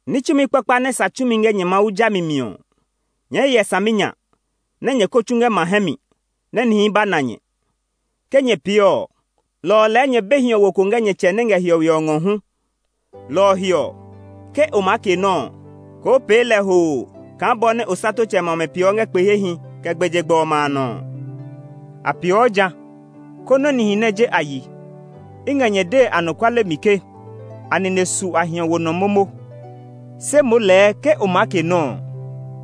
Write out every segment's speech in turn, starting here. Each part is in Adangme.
“Ní tsumi kpakpa nɛ sa tsumi ngɛ nyɛ Mawu jami mi ɔ, nyɛɛ hyɛ saminya nɛ nyɛ kó tsu ngɛ ma hɛ mi nɛ nihi ba na nyɛ. Ke nyɛ pee ɔ, lɔ ɔ lɛɛ nyɛ be hiɔwo ko ngɛ nyɛ Tsɛ nɛ ngɛ hiɔwe ɔ ngɔ hu. “Lɔ ɔ he ɔ, ke o maa ke nɔ́ ɔ, koo pee lɛ hoo kaa bɔ nɛ osatotsɛmɛ ɔmɛ peeɔ ngɛ kpe hehi, kɛ gbɛjegbɛ ɔmɛ a nɔ ɔ. A peeɔ jã, konɛ nihi nɛ je a yi. I ngɛ nyɛ dee anɔkuale mi ke a nine su a hiɔwo nɔ momo. Se moo lɛɛ ke o maa ke nɔ́ ɔ,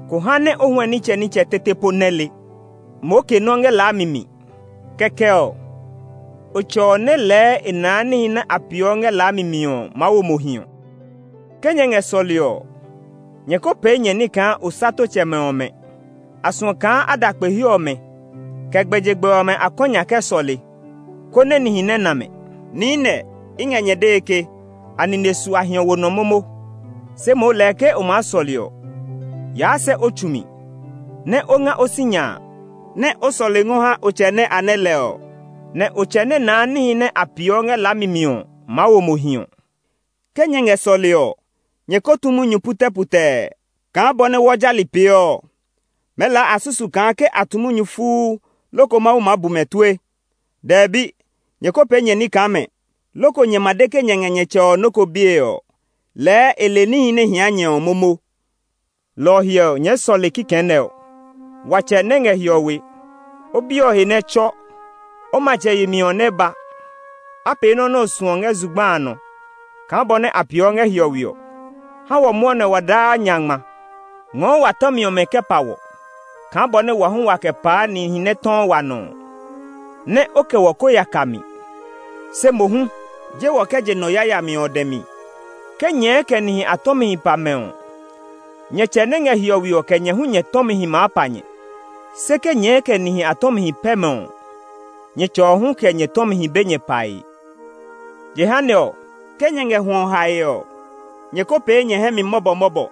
ko ha nɛ o huɛ nitsɛnitsɛ tete po nɛ le; moo ke nɔ́ ngɛ laami mi. Kɛkɛ ɔ, o Tsɛ ɔ nɛ lɛɛ e naa níhi nɛ a peeɔ ngɛ laami mi ɔ maa wo mo hiɔ. “Ke nyɛ ngɛ sɔlee ɔ, nyɛ ko pee nyɛ ní kaa osatotsɛmɛ ɔmɛ! A suɔ kaa a da kpe he ɔmɛ, kɛ gbɛjegbɛ ɔmɛ a kɔ nya kɛ sɔle, konɛ nihi nɛ na mɛ. Niinɛ, i ngɛ nyɛ dee ke a nine su a hiɔwo nɔ momo. Se moo lɛɛ ke o maa sɔle ɔ, yaa sɛ o tsu mi, nɛ o nga sinya a, nɛ o sɔle ngɔ ha o Tsɛ nɛ a nɛ lɛ ɔ. Nɛ o Tsɛ nɛ naa níhi nɛ a peeɔ ngɛ laami mi ɔ maa wo mo hiɔ. “Ke nyɛ ngɛ sɔlee ɔ, nyɛ ko tu munyu putɛputɛɛ kaa bɔ nɛ wɔ jali peeɔ ɔ. Mɛɛ lɛɛ a susuu kaa ke a tu munyu fuu loko Mawu maa bu mɛ tue. Dɛbi, nyɛ ko pee nyɛ ní kaa mɛ! Loko nyɛ ma de ke nyɛ ngɛ nyɛ Tsɛ ɔ nɔ́ ko bie ɔ, lɛɛ e le níhi nɛ hia nyɛ ɔ momo. Lɔ ɔ he ɔ, nyɛɛ sɔle kaa kikɛ nɛ ɔ: ‘Wa Tsɛ nɛ ngɛ hiɔwe; O biɛ ɔ he nɛ tsɔ. O Matsɛ yemi ɔ nɛ ba; a pee nɔ́ nɛ o suɔ ngɛ zugba a nɔ kaa bɔ nɛ a peeɔ ngɛ hiɔwe ɔ. Ha wɔ mwɔnɛ ɔ wa daa nya ngma; Ngɔɔ wa tɔmi ɔmɛ kɛ pa wɔ kaa bɔ nɛ wɔ hu waa kɛ paa nihi nɛ tɔɔ wa nɔ ɔ. Nɛ o kɛ wɔ ko ya ka mi; se mohu, je wɔ kɛ je nɔ yayami ɔ dɛ mi.’ “Ke nyɛɛ kɛ nihi a tɔmihi pa mɛ ɔ, nyɛ Tsɛ nɛ ngɛ hiɔwe ɔ kɛ nyɛ hu nyɛ tɔmihi maa pa nyɛ. Se ke nyɛɛ kɛ nihi a tɔmihi pɛ mɛ ɔ, nyɛ Tsɛ ɔ hu kɛ nyɛ tɔmihi be nyɛ pae. “Jehanɛ ɔ, ke nyɛ ngɛ hwɔ hae ɔ, nyɛ ko pee nyɛ hɛ mi mɔbɔmɔbɔ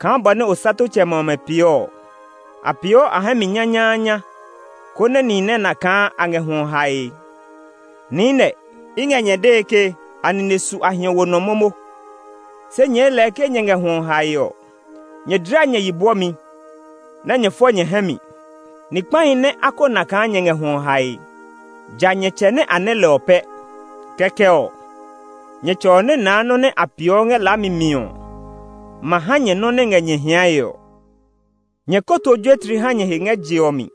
kaa bɔ nɛ osatotsɛmɛ ɔmɛ peeɔ ɔ. A peeɔ a hɛ mi nyanyaanya, konɛ nihi nɛ a na kaa a ngɛ hwɔ hae. Niinɛ, i ngɛ nyɛ dee ke a nine su a hiɔwo nɔ momo. Se nyɛɛ lɛɛ ke nyɛ ngɛ hwɔ hae ɔ, nyɛ dla nyɛ yi bwɔmi, nɛ nyɛ fɔ nyɛ hɛ mi. Ni kpahi nɛ a ko na kaa nyɛ ngɛ hwɔ hae, ja nyɛ Tsɛ nɛ a nɛ lɛ ɔ pɛ. Kɛkɛ ɔ, nyɛ Tsɛ ɔ nɛ naa nɔ́ nɛ a peeɔ ngɛ laami mi ɔ ma ha nyɛ nɔ́ nɛ ngɛ nyɛ hiae ɔ. “Nyɛ ko to juetli ha nyɛ he ngɛ je ɔ mi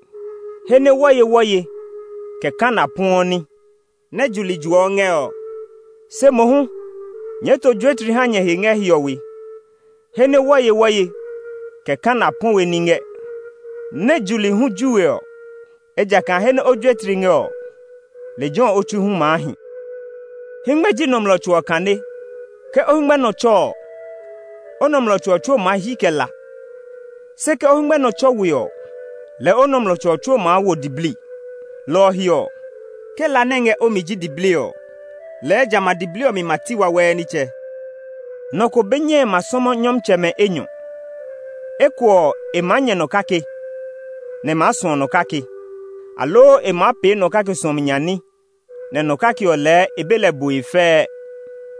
he nɛ wɔyewɔye, kɛ kana puɛɔ ní, nɛ juli juɔ ngɛ ɔ. Se mohu nyɛɛ to juetli ha nyɛ he ngɛ hiɔwe, he nɛ wɔyewɔye, kɛ kana puɛ we ní ngɛ, nɛ juli hu ju we ɔ. Ejakaa he nɛ o juetli ngɛ ɔ, lejɛ ɔ o tsui hu maa hi. “Hɛngmɛ ji nɔmlɔ tso ɔ kane. Ke o hɛngmɛ nɔ tsɔ ɔ, o nɔmlɔ tso ɔ tsuo ma hyi kɛ la. Se ke o hɛngmɛ nɔ tsɔ we ɔ, lɛɛ o nɔmlɔ tso ɔ tsuo maa wo diblii. Lɔ ɔ he ɔ, ke la nɛ ngɛ o mi ji diblii ɔ, lɛɛ jamɛ a diblii ɔ mi ma ti wawɛɛ nitsɛ. “Nɔ ko be nyɛe ma sɔmɔ nyɔmtsɛmɛ enyɔ; eko ɔ, e maa nyɛ nɔ kake, nɛ e maa suɔ nɔ kake; aloo e maa pee nɔ kake suɔmi nya ní, nɛ nɔ kake ɔ lɛɛ e be lɛ bue fɛɛ.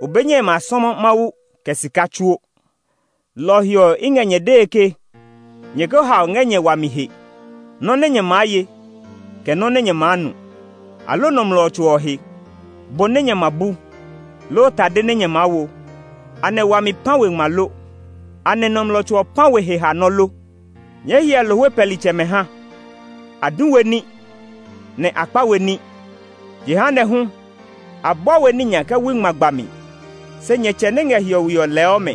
O be nyɛe ma sɔmɔ Mawu kɛ sika tsuo. “Lɔ ɔ he ɔ, i ngɛ nyɛ dee ke nyɛ ko hao ngɛ nyɛ wami he, nɔ́ nɛ nyɛ maa ye, kɛ nɔ́ nɛ nyɛ maa nu, aloo nɔmlɔ tso ɔ he, bo nɛ nyɛ ma bu, loo tade nɛ nyɛ maa wo. Anɛ wami pã we ngma lo? Anɛ nɔmlɔ tso ɔ pã we heha nɔ́ lo? Nyɛɛ hyɛ lohwe pɛlitsɛmɛ ha; a du we ní, nɛ a kpa we ní; jehanɛ hu, a bua we ní nya kɛ wui ngma gba mi. Se nyɛ Tsɛ nɛ ngɛ hiɔwe ɔ lɛɔ mɛ.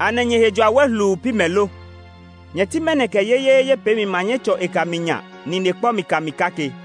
Anɛ nyɛ he jua wɛ hluu pi mɛ lo? Nyɛ ti mɛnɔ kɛ yeyeeye peemi ma nyɛ tsɔ e kami nya nine kpɔ mi kami kake?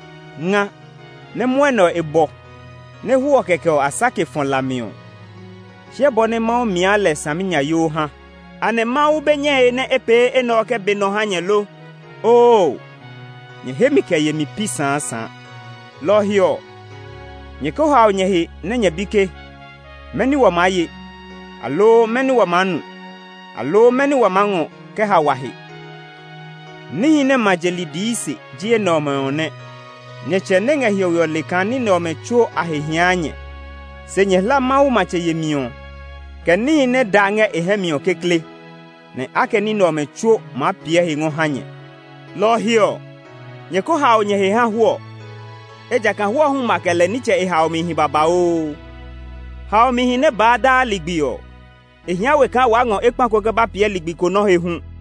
Nga, nɛ mwɔnɛ ɔ e bɔ, nɛ hwɔɔ kɛkɛ a sake kɛ fɔ la mi ɔ, hyɛ bɔ nɛ Mawu mia lɛ saminyayoo ha! Anɛ Mawu be nyɛe nɛ e pee enɛ ɔ kɛ be nɔ ha nyɛ lo! Oo, nyɛ hemi kɛ yemi pi saasaa! “Lɔ ɔ he ɔ, nyɛ ko hao nyɛ he nɛ nyɛ bi ke, ‘Mɛni wa maa ye? Aloo mɛni wa maa nu? Aloo mɛni wa maa ngɔ kɛ ha wa he?’ Níhi nɛ ma je li dii se ji enɛ ɔmɛ nɛ. Nyɛ Tsɛ nɛ ngɛ hiɔwe ɔ le kaa ní nɛ ɔmɛ tsuo a he hia nyɛ. Se nyɛ hla Mawu matsɛ yemi ɔ, kɛ níhi nɛ da ngɛ e hɛ mi ɔ kekle, nɛ a kɛ ní nɛ ɔmɛ tsuo maa piɛ he ngɔ ha nyɛ. Lɔ ɔ he ɔ, nyɛ ko hao nyɛ he ha hwɔɔ; ejakaa hwɔɔ hu ma kɛ lɛ nitsɛ e haomihi babauu. Haomihi nɛ baa daa ligbi ɔ, e hia we kaa waa ngɔ ekpa ko kɛ ba piɛ ligbi ko nɔ́ he hu.